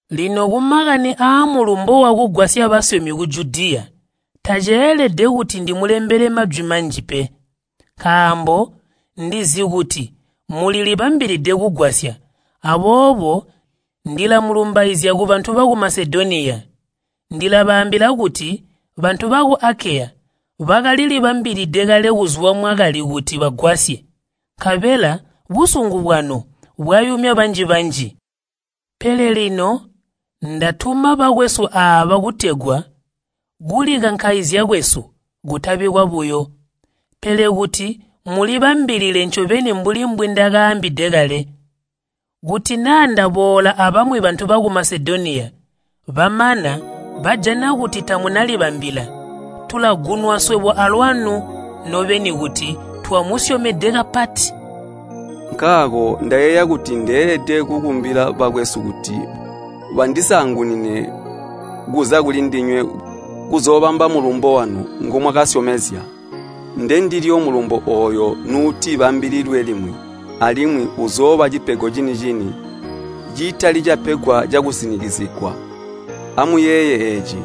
Lino kumakani aamulumbo wakugwasya basyomi ku Judiya, taceelede kuti ndimulembele majwi manji pe. Nkaambo ndizi kuti mulilibambilide kugwasya, aboobo ndilamulumbaizya kubantu baku Masedoniya. Ndilabaambila kuti bantu baku Akeya bakalilibambilide kale kuzwa mwakali kuti bagwasye, nkabela busungu bwanu bwayumya banji-banji. Pele lino ndatuma bakwesu aaba kutegwa kulikankaizya kwesu kutabi kwabuyo, pele kuti mulibambilile ncobeni mbuli mbwindakaambide kale. Kuti naa ndaboola abamwi bantu baku Masedoniya, bamana bajana kuti tamunalibambila, tulagunwa swebo alwanu nobeni kuti twamusyomede kapati. Nkaako ndakayeeya kuti ndeelede kukumbila bakwesu kuti bandisaangunine kuza kulindinywe kuzoobamba mulumbo wanu ngomwakasyomezya. Ndendilyo mulumbo ooyo nuuti bambililwe limwi alimwi uzooba cipego cini-cini, citali capegwa cakusinikizigwa. Amuyeeye eeci,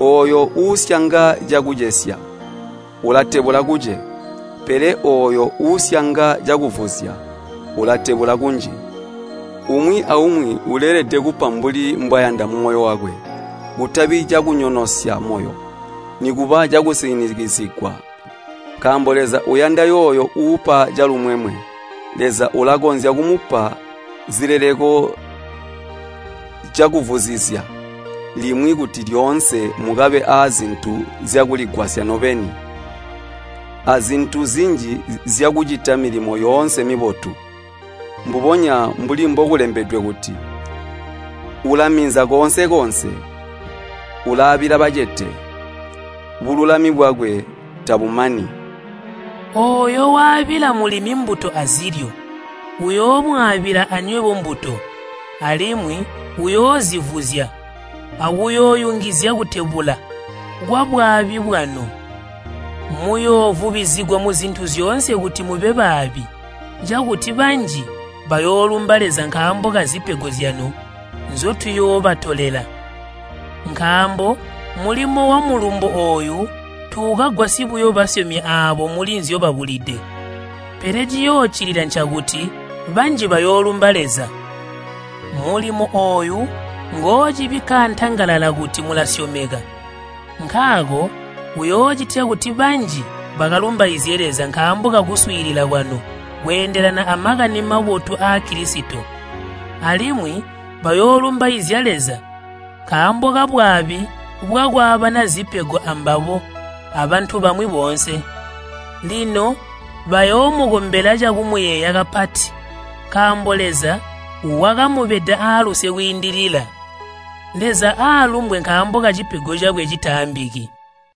ooyo uusyanga cakucesya ulatebula kuce, pele ooyo uusyanga cakuvuzya ulatebula kunji. Umwi aumwi uleelede kupa mbuli mbwayanda mumoyo wakwe, kutabi cakunyonosya moyo nikuba cakusinikizigwa, nkaambo Leza uyanda yooyo uupa calumwemwe. Leza ulakonzya kumupa zileleko cakuvuzizya limwi kuti lyoonse mukabe aazintu zyakuligwasya nobeni, azintu zinji zyakucita milimo yoonse mibotu. Mbubonya mbuli mbokulembedwe kuti, “Ulaminza koonse-koonse, ulaabila bacete, bululami bwakwe tabumani.” Ooyo waabila mulimi mbuto azilyo, uyoomwaabila anywebo mbuto, alimwi uyoozivuzya akuyooyungizya kutebula kwabwaabi bwanu. Muyoovubizigwa muzintu zyoonse kuti mube baabi, cakuti banji bayoolumba Leza nkaambo kazipego zyanu nzyotuyoobatolela. Nkaambo mulimo wamulumbo ooyu tuukagwasyi buyo basyomi aabo muli nzyobabulide, pele ciyooccilila ncakuti banji bayoolumba Leza. Mulimo ooyu ngoocibikka antangalala kuti mulasyomeka, nkaako uyoocitya kuti banji bakalumbaizye Leza nkaambo kakuswiilila kwanu kweendelana a Makani Mabotu aa Kilisito. Alimwi bayoolumbaizya Leza nkaambo kabwaabi bwakwaabana zipego ambabo abantu bamwi boonse. Lino bayoomukombela cakumuyeeya kapati, nkaambo Leza wakamubeda aaluse kwiindilila. Leza aalumbwe nkaambo kacipego cakwe citaambiki!